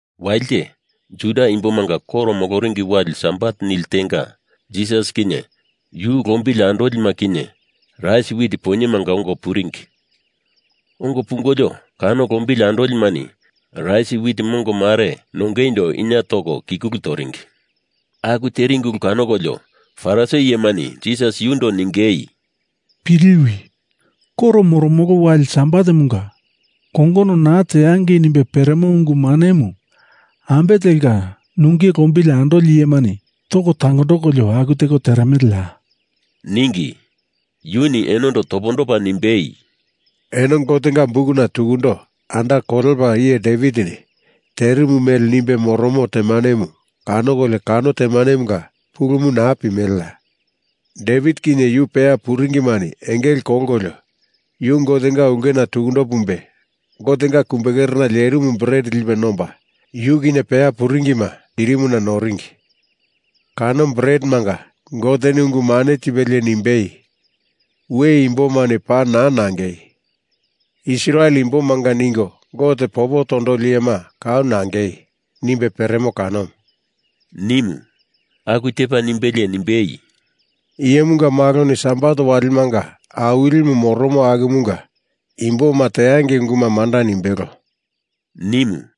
Walite, Juda imbomanga koro moloringi wali sabat nili tenga, Jisas kinye yu lombili andolima kinye rais wit poinyemanga ongo puringi. Ongo pungolio kano lombili andolimani rais wit mongo mare nongeindo inie toko kikulu toringi. Aku teringi ulu kanokolio Farisi iyemani Jisas yundo ningei, “Piliwi! Koro moromolo wali Sabatemunga kongono naa teangei nimbe peremo ungu manemu ambe telka nunge lombili andoli iyemani toko tangondokolio aku teko teremeleya?” ningi. Yuni enondo topondopa nimbei, “Eno Gotenga Bukuna tukundo anda kolepa iye Devitini terimu mele nimbe moromo temanemu kanokolio kano temanemunga pulumu naa pimeleya? Devit kinye yu peya puringimani engele kolkolio, yu Gotenga ulkena tukundo pumbe, Gotenga kumbekerena lerimu bret lipe nomba, yu kinye peya puringima tirimuna noringi. Kano bretemanga Goteni ungu mane tipelie nimbei, ‘We imbomani paa naa nangei! Israel imbomanga ningo Gote popo tondoli iyema kau nangei,’ nimbe peremo kanomu,” nimu. Aku tepa nimbelie nimbei, “Iyemunga Maloni Sabat walimanga Awilimu moromo akumunga imboma teangei unguma manda nimbelo,” nimu.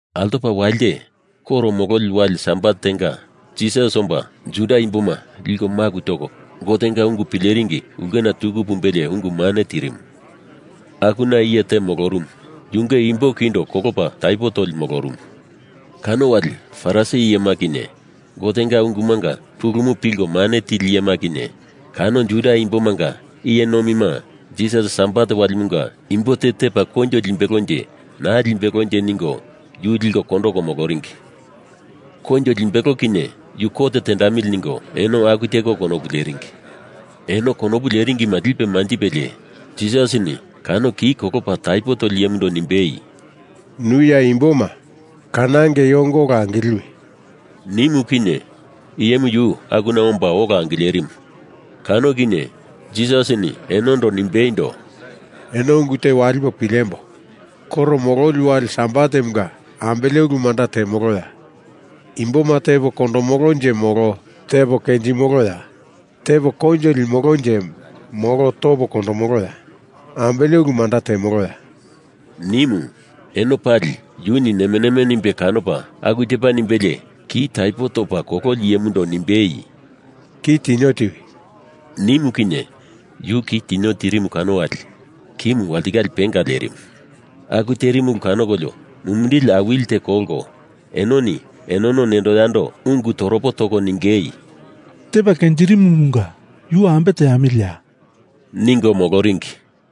Altopa walite, koro mololi wali Sabat tenga, Jisas omba Juda imboma liko maku toko Gotenga ungu pileringi ulkena tuku pumbelie ungu mane tirimu. Akuna iye te molorumu, yunge imbo kindo kolopa taipo toli molorumu. Kano wali Farisi iyema kinye, Gotenga ungumanga pulumu pilko mane tili iyema kinye, kano Juda imbomanga iye nomima Jisasini Sabat walimunga imbo te tepa koinjo limbelonje naa limbelonje ningo yu liko kondoko moloringi. Koinjo limbelo kinye yu kot tendamili ningo eno aku teko konopu leringi. Eno konopu leringi mele lipe manjipelie Jisasini kano ki kolopa taipo toli iyemundo nimbei, “Nu ya imboma kanongeindo ongo ola angiliwi,” nimu kinye iyemu yu akuna omba ola angilerimu. Kano kinye Jisasini enondo nimbeindo, “Eno ungu te walipo pilembo! Koro mololi wali sabatemunga ambele ulu manda temoloya? Imboma tepo kondomolonje molo tepo kenjimoloya? Tepo koinjo limolonje molo topo kondomoloya? Ambele ulu manda temoloya?” nimu. Eno pali yuni neme neme nimbe kanopa aku tepa nimbelie ki taipo topa kololi iyemundo nimbei, “Ki tinio tiwi,” nimu kinye yu ki tinio tirimu kano wali kimu walitikale penga lerimu. Aku terimu ulu kanokolio mumindili awili teko kolko enoni enono nendo yando ungu toropo toko ningei, “Tepa kenjirimumunga yu ambe teamiliya?” ningo moloringi.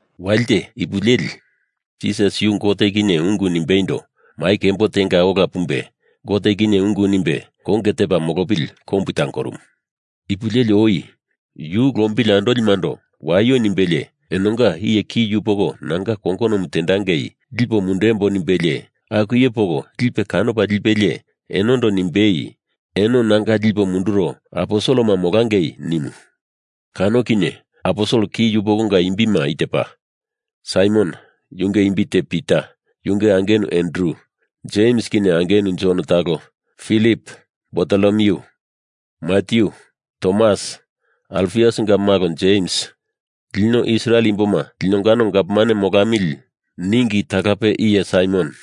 Walite ipu leli Jisas yu Gote kinye ungu nimbeindo mai kembo tenga ola pumbe Gote kinye ungu nimbe konge tepa molopili kombu tangorumu. Ipu leli oi yu lombili andolimando waio nimbelie enonga iye ki yupoko nanga kongonomu teangei lipo mundembo nimbelie aku iye poko lipe kanopa lipelie enondo nimbei, “Eno nanga lipo munduro aposelema molangei,” nimu. Kano iye aposel ki yupokonga imbima i tepa: Saimon yunge imbi te Pita, yunge angenu Andru, Jems kinye angenu Jon talo, Filip, Bartolomyu, Matyu, Tomas, Alfiusinga malo Jems, lino Israel imboma linongano gavman molamili ningi talape iye Saimon,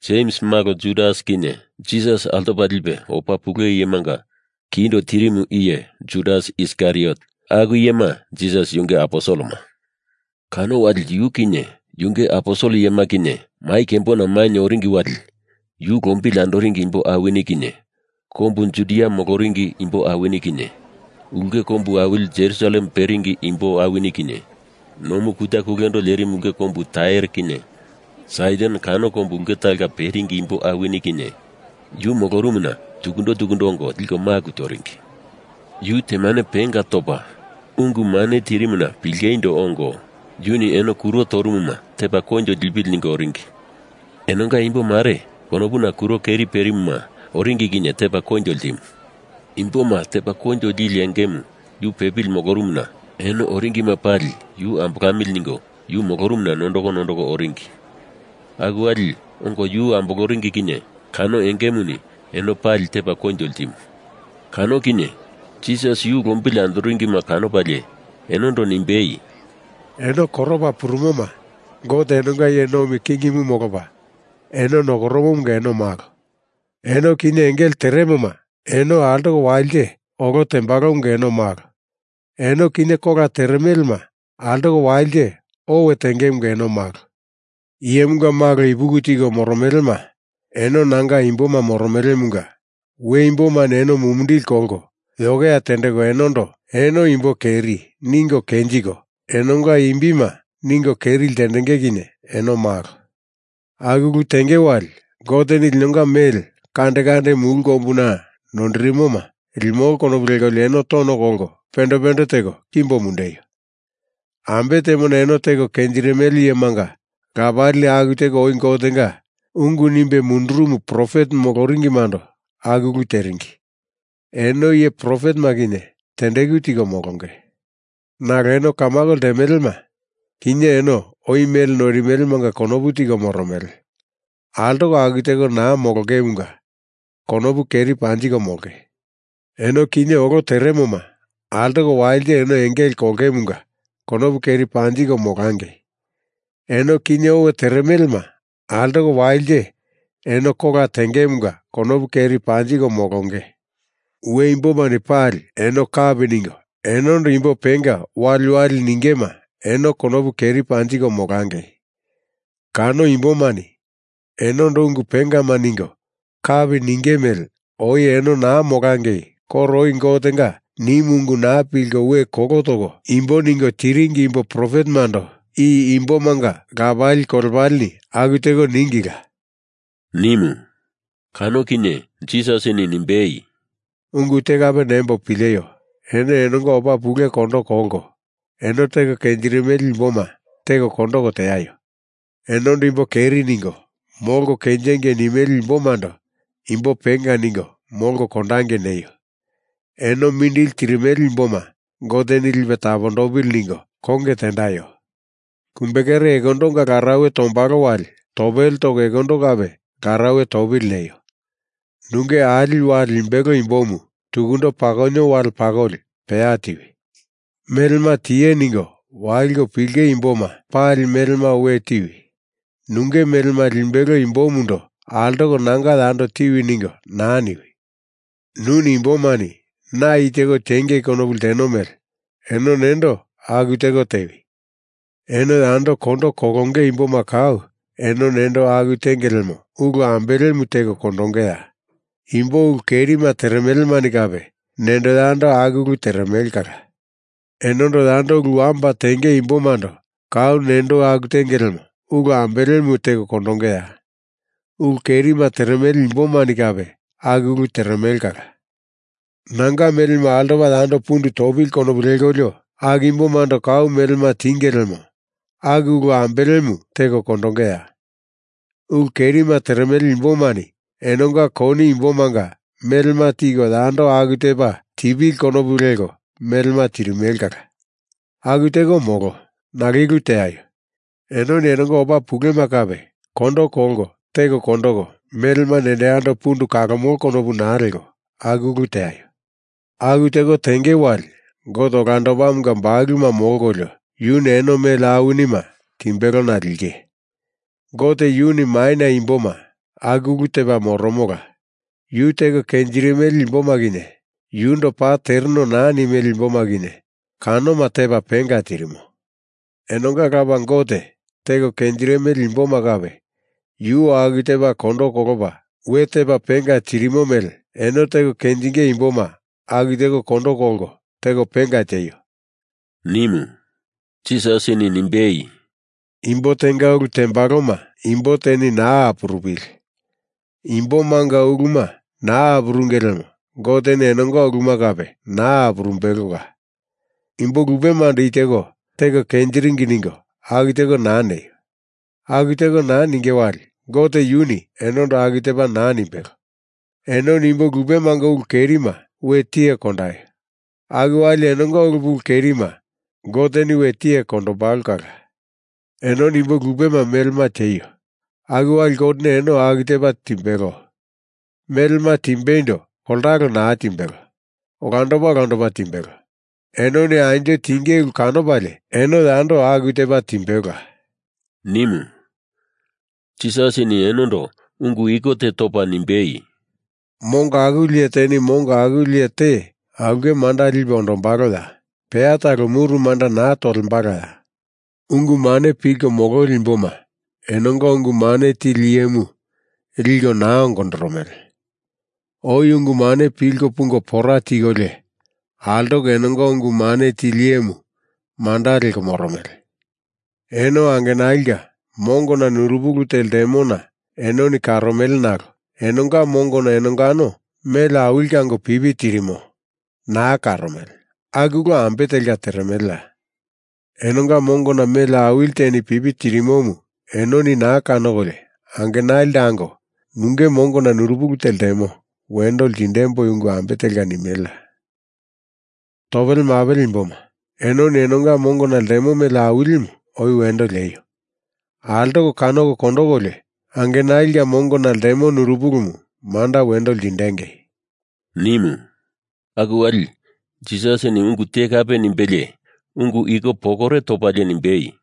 Jems malo Judas kinye, Jisas altopa lipe opa pule iyemanga kindo tirimu iye Judas Iskariot, aku iyema Jisas yunge aposelema. Kano wali yu kinye yunge aposel iyema kinye mai kembona mainye oringi wali yu lombili andoringi imbo awini kinye, kombu Judia moloringi imbo awini kinye, ulke kombu awili Jerusalem peringi imbo awini kinye, nomu kuta kulendo lerimu ulke kombu Tair kinye Saidon kano ulke kombu talonga peringi imbo awini kinye, yu molorumuna tukundo tukundo ongo liko maku toringi. Yu temane penga topa, ungu mane tirimuna pilingeindo ongo, yuni eno kuro torumuma tepa koinjo lipili ningo oringi. Enonga imbo mare konopuna kuro keri perimuma oringi kinye tepa koinjo ltimu. Imboma tepa koinjo lili engemu yu pepili molorumuna eno oringima pali yu ambolamili ningo yu molorumuna nondoko nondoko oringi. Aku wali ongo yu amboloringi kinye kano engemuni eno pali tepa koinjo ltimu. Kano kinye Jisas yu lombili andoringima kanopalie enondo nimbei, “Eno koropa purumuma Gote enonga iye nomi kingimu molopa eno nokoromomunga eno malo. Eno kinye engele teremoma eno altoko walite olo tembalomunga eno malo. Eno kinye kola teremelema altoko walite owe tengemunga eno malo. Iyemunga Malo ipuki tiko moromelema, eno nanga imboma moromelemunga we imbomani eno mumindili kolko yokeya tendeko enondo eno imbo keri ningo kenjiko, enonga imbima ningo keri ltendenge kinye eno malo. Aku ulu tenge wali Goteni linonga mele kande kande mulu kombuna noindirimona limolo konopu lekolio eno tono kolko pende pende teko kimbo mundeio. Ambe temona eno teko kenjirimele iyemanga lapalini aku teko oi Gotenga ungu nimbe mundurumu profet moloringimando aku ulu teringi. Eno iye profetema kinye tendeku tiko molonge. Nalo eno kamako ltemelema, kinye eno oi mele noirimelemanga konopu tiko moromele, altoko aku teko naa molongemunga konopu keri panjiko molonge! Eno kinye olo teremoma altoko walite eno engele kolongemunga konopu keri panjiko molangei! Eno kinye owe teremelema altoko walite eno kola tengemunga konopu keri panjiko molonge! We imbomani pali eno kapi ningo enondo imbo penga waliwali ningema eno konopu keri panjiko molangei! Kano imbomani enondo ungu pengama ningo kapi ninge mele oi eno naa molangei koro oi Gotenga nimu ungu naa pilko we kolo toko imbo ningo tiringi imbo profetemando i imbomanga lapali kolepalemani aku teko ningila,” nimu. Kano kinye Jisasini nimbei, “Ungu te kape nembo pileio! Eno enonga opa pule kondo kolko, eno teko kenjirimele imboma teko kondoko teaio! Enondo Imbo keri ningo molko kenjengei nimele imbomando imbo penga ningo molko kondangei neio! Eno mindili tirimele imboma Goteni lipe tapondopili ningo konge tendaio! Kumbekere ekondonga larauwe tombalo wali topele toko ekondo kape larauwe topili neio. Nunge ali wale limbelo imbomu tukundo pakonio wale pakoli peya tiwi! Melema tiye ningo waliko pilinge imboma pali melema we tiwi nunge melema limbelo imbomundo altoko nanga yando tiwi ningo naa niwi! Nuni imbomani na i teko teangei konopu lteno mele, eno nendo aku teko tewi! Eno yando kondo kolonge imboma kau eno nendo aku tenge lemo ulu ambelemu teko kondongeya? Imbo ulu kerima teremelemani kape nendo yando aku ulu teremele kala. Enondo yando ulu wamba tenge imbomando kau nendo aku tenge lemo ulu ambelemu teko kondongeya? Ulu kerima teremele imbomani kape aku ulu teremele kala. Nanga melemu altopa yando pundu topili konopu lekolio aku imbomando kau melema tinge lemo aku ulu ambelemu teko kondongeya? Ulu kerima teremele imbomani enonga koni imbomanga melema tiko yando aku tepa tipili konopu leko melema tirimele kala. Aku teko molo. Nalo i ulu teaio. Enoni enonga opa pulema kape kondo kolko teko kondoko melema nendo yando pundu kalomolo konopu naa leko aku ulu teaio. Aku teko tenge wali Gote Olandopamunga bakuluma molkolio, yuni eno mele awinima timbelona linge. Gote yuni maina imboma aku ulu tepa moromola. Yu teko kenjirimele imboma kinye, yundo paa tereno naa nimele imboma kinye kanoma tepa penga tirimo. Enonga Lapa Gote teko kenjirimele imboma kape yu aku tepa kondo kolopa we tepa penga tirimo mele eno teko kenjinge imboma aku teko kondo kolko teko penga tieio,” nimu. Jisasini nimbei, “Imbo tenga ulu tembaloma imbo teni naa apurupili! Imbomanga uluma naa apurunge lemo Goteni enonga uluma kape naa apurumbelola. Imbo lupemando i teko teko kenjiringi ningo aku teko naa neio! Aku teko naa ninge wali Gote yuni enondo aku tepa naa nimbelo. Enoni imbo lupemanga ulu kerima we tiye kondaio! Aku wali enonga ulu pulu kerima Goteni we tiye kondombalo kala. Enoni imbo lupema melema tieio! Aku wali Goteni eno aku tepa timbelo. Melema timbeindo koltalo naa timbelo, olandopa olandopa timbelo. Enoni anjo tinge ulu kanopalie eno yando aku tepa timbelola,” nimu. Jisasini enondo ungu iko te topa nimbei, “Mongo akuli iye teni mongo akuli iye te aulke manda lipe ondombaloya? Peya talo muru manda naa tolkaya? Ungu mane pilko mololi imboma enonga ungu mane tili iyemu liko naa ongondoromele. Oi ungu mane pilko pungo pora tikolio altoko enonga ungu mane tili iyemu manda leko moromele. Eno angenalinga mongona nurupili te ltemona enoni karomele nalo enonga mongona enongano mele awili kango pipi tirimo naa karomele aku ulu ambe telka teremeleya? Enonga mongona mele awili teni pipi tirimomu enoni naa kanokolio angenalindo ango, nunge mongona nurupili te ltemo wendo lindemboi ungu ambe telka nimeleya? Topele mapele imboma, enoni enonga mongona ltemo mele awilimu oi wendo lieio! Altoko kanoko kondokolio angenalinga mongona ltemo nurupilimu manda wendo ltindengei,” nimu. Aku wali Jisasini ungu te kape nimbelie ungu iko pokore topalie nimbei,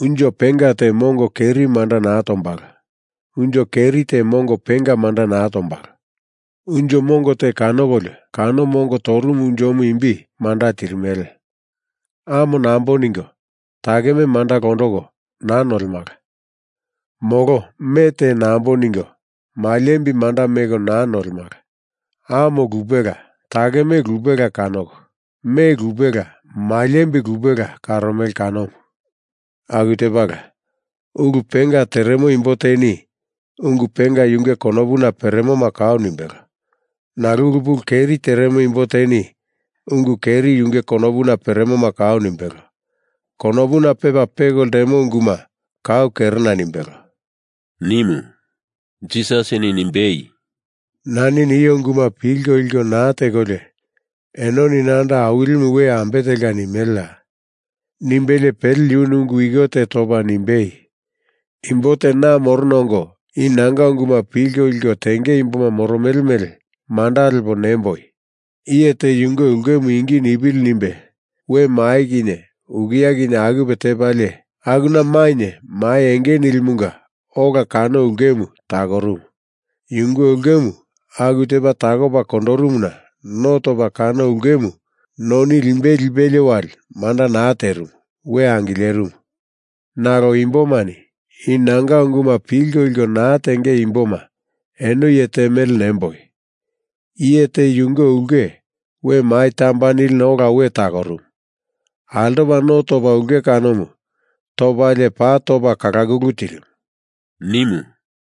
“Unjo penga te mongo keri manda naa tombalo. Unjo keri te mongo penga manda naa tombalo. Unjo mongo te kanokolio kano mongo torumu unjomu imbi manda tirimele. Amo nambo ningo, takeme manda londoko naa nolemala. Molo me te nambo ningo, maliembi manda meko naa nolemala. Amo lupela takeme lupela kanoko, me lupela maliembi lupela karomele kanomu. Aku tepala, ulu penga teremo imbo teni ungu penga yunge konopuna peremoma kau nimbelo. Nalo ulu pulu keri teremo imbo teni ungu keri yunge konopuna peremoma kau nimbelo. Konopuna pepa peko ltemo unguma kau kerena nimbelo,” nimu. Jisasini nimbei, “Nani nio unguma pilko liko naa tekolio enoni nando Awilimu we ambe telka nimeleya?” nimbelie pele yuni ungu iko te topa nimbei, “Imbo te na morona ongo i nanga unguma pilko liko tenge imboma moromele mele manda lepa nemboi. Iye te yunge ulkemu ingi nipili nimbe we mai kinye ukia kinye akupe tepalie, akuna mainye mai enge nilimunga ola kano ulkemu takorumu. Yunge ulkemu aku tepa takopa kondorimuna no topa kano ulkemu noni limbei lipelie wali manda naa terimu, we angilerimu. Nalo imbomani i nanga unguma pilko liko naa tenge imboma eno iye te mele nemboi. Iye te yunge ulke we mai tamba nilina ola we takorumu. Altopa no topa ulke kanomu topalie paa topa kalakulu tirimu,” nimu.